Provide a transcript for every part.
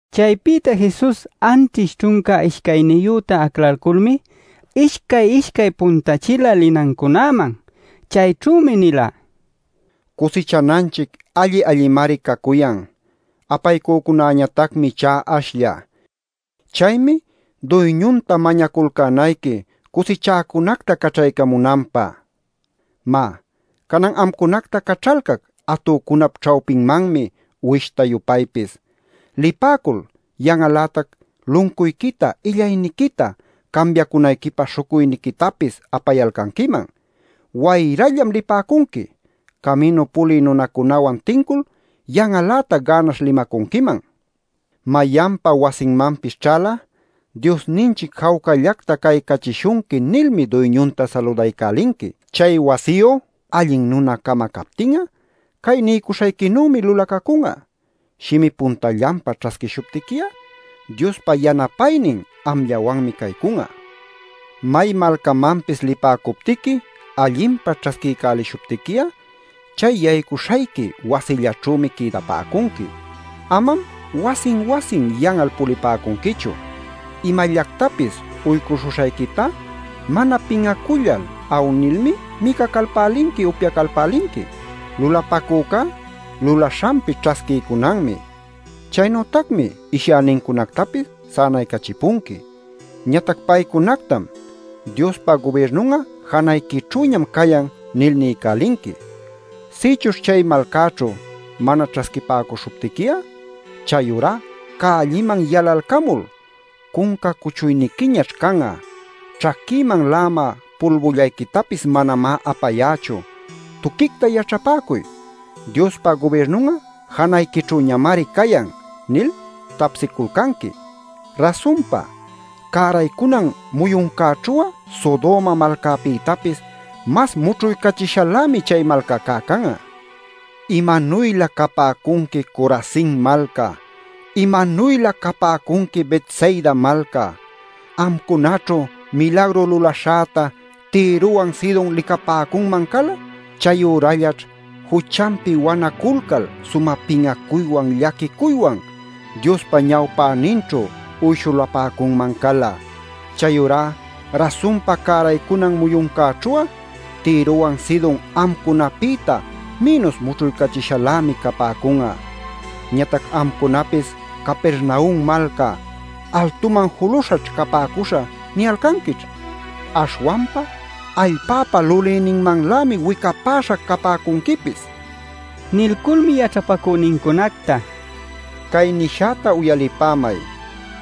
Chaypïta Jesus anćhish ćhunca ishcayniyüta aclalculmi ishcay-ishcay puntachila linancunäman. Chayćhümi nila: “Cusichananchic alli-allimari cacuyan; apaycücunäñatacmi ichá ashlla. Chaymi Duyñunta mañaculcänayqui cusichäcunacta caćhaycamunanpä. “Má, Canan amcunacta caćhalcac atücunap ćhawpinmanmi uwishta-yupaypis. Lipäcul yan'al-lätac luncuyquita, illayniquita, cambiacunayquipä śhucuyniquitapis apayalcanquiman. Wayrallam lipäcunqui. Caminu pulï nunacunawan tincul yan'al-lätac gänaśh limacunquiman. Mayanpa wasinmanpis ćhal'a ‘Diosninchic jawcallacta caycachishunqui’ nilmi duyñunta saludaycälinqui. Chay wasiyu allin nuna-cama captin'a cay niycuśhayquinümi lulacacun'a. Shimi puntallanpa ćhasquishuptiqui'a Diospa yanapaynin amllawanmi caycun'a. “May malcamanpis lipäcuptiqui allinpa ćhasquiycälishuptiqui'a chay yaycuycuśhayqui wasillaćhümi quïdapäcunqui. Amam wasin-wasin yan'al pulipäcunquichu. Imallactapis uycuśhuśhayquitá mana pin'acullal awnilmi micacalpälinqui, upyacalpälinqui. Lulapacücá lulaśhanpi ćhasquiycunanmi. “Chaynütacmi ishyänincunactapis sänaycachipunqui. Ñatac paycunactam: ‘Diospa gubirnun'a janayquićhüñam cayan’ nil niycälinqui. Sïchuśh chay malcäćhu mana ćhasquipäcuśhuptiqui'a chayurá cälliman yalalcamul: ‘Cunca cuchuyniquiñaćh can'a. Ćhaquïman la'amä pulbullayquitapis manamá apayächu. Tuquicta yaćhapäcuy: ¡Diospa gubirnun'a janayquićhüñamari cayan!’ nil tapsiculcanqui. Rasunpa, cäraycunan muyuncäćhu'a Sodoma malcapïtapis mas mućhuycachishalämi chay malcacá can'a. “¡Imanuylä capäcunqui Corazin malca! ¡Imanuylä capäcunqui Betsaida malca! Amcunaćhu milagru lulaśhäta Tirowan Sidon licapäcunman cala. Chayürallaćh juchanpi wanaculcal sumä pin'acuywan llaquicuywan Diospa ñawpäninćhu uyshuläpacunman cala. Chayurá rasunpa cäraycunan muyuncäćhu'a Tirowan Sidon amcunapïta mïnus mućhuycachishalämi capäcun'a. Ñatac amcunapis Capernaum malca ‘Altuman juluśhaćh capäcuśhä’ niyalcanquićh. Aśhwanpa allpäpa lulïninmanlämi wicapäśha capäcunquipis” nila. Nilculmi yaćhapacünincunacta: “Cay nishäta uyalipämay.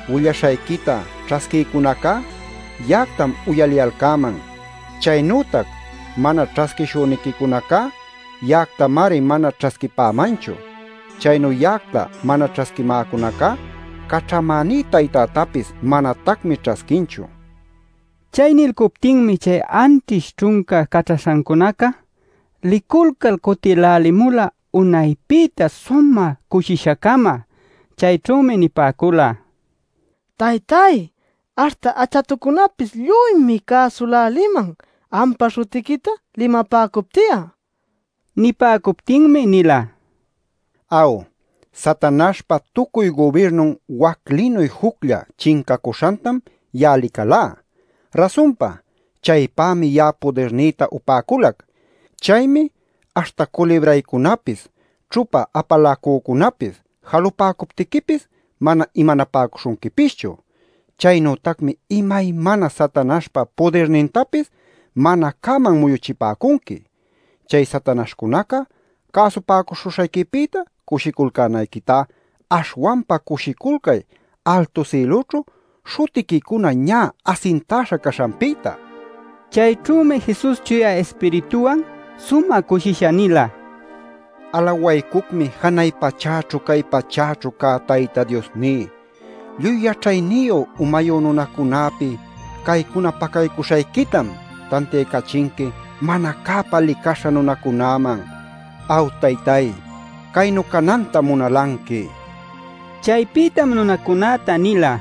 Willaśhayquita ćhasquïcunacá, ya'actam uyaliyalcäman. Chaynütac mana ćhasquishüniquicunacá ya'actamari mana ćhasquipämanchu. Chaynu ya'acta mana ćhasquimäcunacá caćhamäní Taytätapis manatacmi ćhasquinchu” nila. Chay nilcuptinmi chay anćhish ćhunca caćhaśhancunaca liculcal cutïlälimula unaypïtá sumä cushisha-cama. Chayćhümi nipäcula: “Taytay, aśhta achatucunapis lluymi cäsüläliman ampa śhutiquita limapäcupti'a” nil. Nipäcuptinmi nila: “Aw, Satanaśhpa tucuy gubirnun waclinuy juclla chincacuśhantam ya'a licalá. Rasunpa, chaypämi ya'a pudirnïta upäculac. Chaymi aśhta culibraycunapis, ćhupa apaläcucunapis jalupäcuptiquipis mana imanapäcuśhunquipischu. Chaynütacmi imaymana Satanaśhpa pudirnintapis mana cäman muyuchipäcunqui. Chay satanaśhcunaca cäsupäcuśhuśhayquipïta cushiculcänayquitá aśhwanpa cushiculcay altu sïlućhu śhutiquicuna ñä asintäśha caśhanpïta” nil. Chayćhümi Jesus Chuya Ispirituwan sumä cushisha nila: “Alawaycucmi janay pachäćhu cay pachäćhu cä Tayta Diosní. Lluy yaćhayniyu, umayu nunacunäpi caycuna pacaycuśhayquitam tantiaycachinqui mana cäpa licaśha nunacunäman. Aw, Taytay, caynu canantam munalanqui” nil. Chaypïtam nunacunäta nila: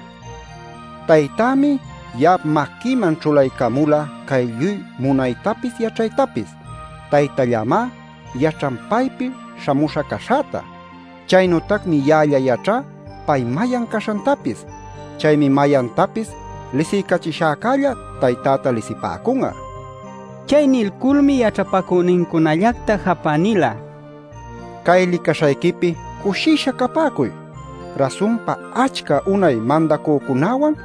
“Taytämi ya'ap maquïman ćhulaycamula cay lluy munaytapis yaćhaytapis. Taytallämá yaćhan paypi śhamüśha caśhäta. Chaynütacmi ya'alla yaćhá pay mayan caśhantapis. Chaymi mayantapis lisiycachishäcälla Taytäta lisipäcun'a” nil. Chay nilculmi yaćhapacünincunallacta japä nila: “Cay licaśhayquipi cushisha capäcuy. Rasunpa achca unay mandacücunäwan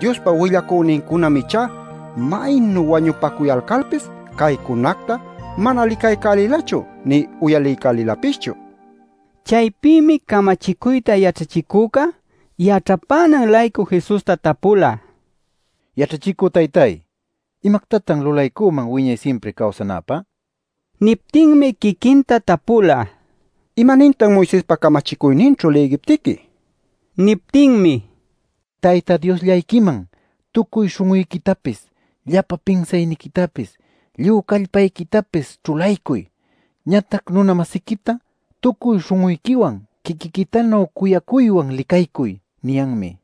Diospa willacünincunam ichá maynu wañupacuyalcalpis caycunacta mana licaycälilachu nï uyaliycälilapischu” nil. Chaypïmi camachicuyta yaćhachicüca yaćhapänan-laycu Jesusta tapula: “Yaćhachicü taytay, ¿imactatan lulaycüman wiñay simpri cawsanäpä?” nil. Niptinmi quiquinta tapula: “¿Imanintan Moisespa camachicuyninćhu lïgiptiqui?” nil. Niptinmi: “ ‘Tayta Diosllayquiman tucuy śhun'uyquitapis, llapan pinsayniquitapis, lluy callpayquitapis ćhulaycuy. Ñatac nuna-masiquita tucuy śhun'uyquiwan quiquiquitanuy cuyacuywan licaycuy’ niyanmi” nila.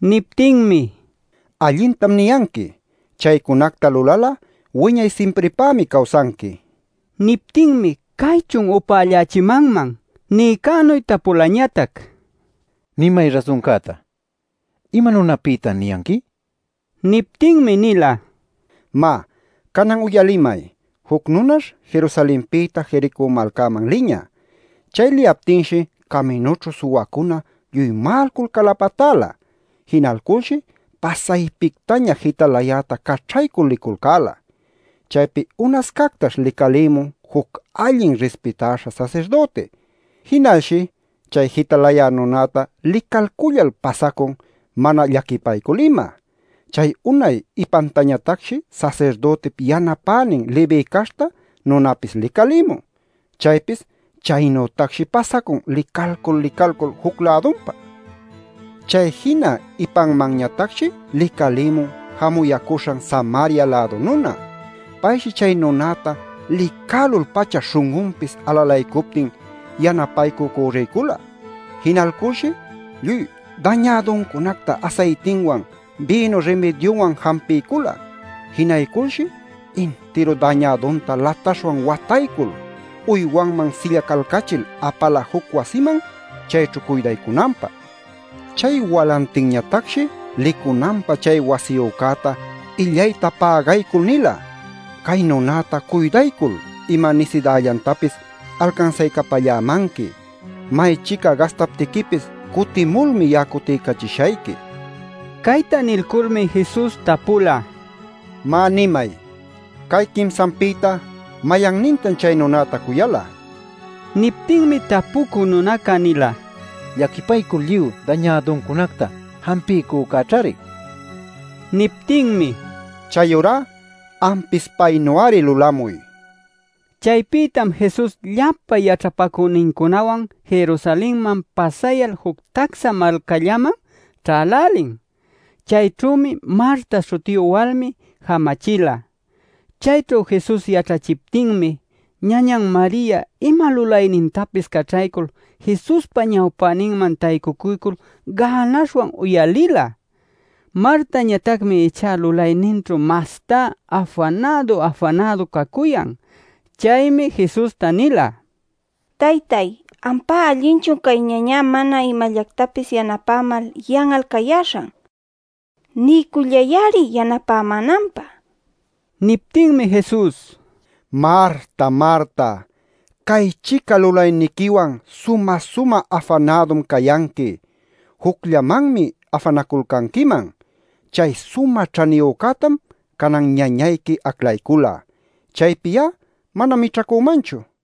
Niptinmi: “Allintam niyanqui. Chaycunacta lulal'a wiñay simpripämi cawsanqui” nin. Niptinmi “¿Caychun upällächimanman?” niycänu tapulañatac: “Nimay rasuncäta. ¿Ima nunapïtan niyanqui?” nil. Niptinmi nila: “Má, canan uyalimay. Juc nunash Jerusalenpïta Jericó malcaman liñä. Chay liyaptinshi caminućhu suwacuna lluy ma'alcul calapatäla. Jinalculshi pasaypictaña jitalayäta caćhaycul liculcäla. Chaypi unascactash licalïmun juc allin rispitaśha sasirdüti. Jinalshi chay jitalayä nunäta licalcullal pasacun mana llaquipaycul ima. Chay unay ipantañatacshi sasirdütip yanapänin Leví caśhta nunapis licalïmun. Chaypis chaynütacshi pasacun licalcul licalcul juc-lädunpa. Chay jina ipanmanñatacshi licalïmun jamuyäcuśhan Samaria-lädu nuna. Payshi chay nunäta licälul-pacha śhun'unpis alalaycuptin yanapaycü cürriycula. Jinalculshi lluy dañäduncunacta asaytinwan bïnu rimidyunwan jampiycula. Jinayculshi intiru dañädunta lataśhwan wataycul uywanman sillacalcachil apala juc wasiman chayćhu cuydaycunanpä. Chay walantinñatacshi licunanpä chay wasiyücäta illayta pägaycul nila: ‘Cay nunäta cuydaycul ima nisidällantapis alcansaycapällämanqui. Maychica gastaptiquipis cutimulmi ya'a cutiycachishayqui’” nil. Cayta nilculmi Jesus tapula: “Má nimay, cay quimsanpïta ¿mayannintan chay nunäta cuyala?” nil. Niptinmi tapucü nunaca nila: “Llaquipaycul lluy dañäduncunacta jampiycücäćhari” nil. Niptinmi: “Chayurá ampis paynu-ari lulamuy” nila. Chaypïtam Jesus llapa yaćhapacünincunawan Jerusalenman pasayal juc tacsa malcallaman ćhälälin. Chayćhümi Marta śhutiyu walmi jamachila. Chayćhu Jesus yaćhachiptinmi ñañan Maria ima lulaynintapis caćhaycul Jesuspa ñawpäninman taycucuycul gänaśhwan uyalila. Martañatacmi ichá lulayninćhu mastá afanädu-afanädu cacuyan. Chaymi Jesusta nila: “Taytay, ¿ampá allinchun cay ñañá mana imallactapis yanapämal yan'al cayäśhan? Niycullay-ari yanapämänanpä” nil. Niptinmi Jesus: “Marta, Marta, cay-chica lulayniquiwan sumä-sumä afanädum cayanqui. Jucllamanmi afanaculcanquiman. Chay sumä ćhaniyücätam canan ñañayqui aclaycula; chaypi ya'a manam mićhacümanchu” nila.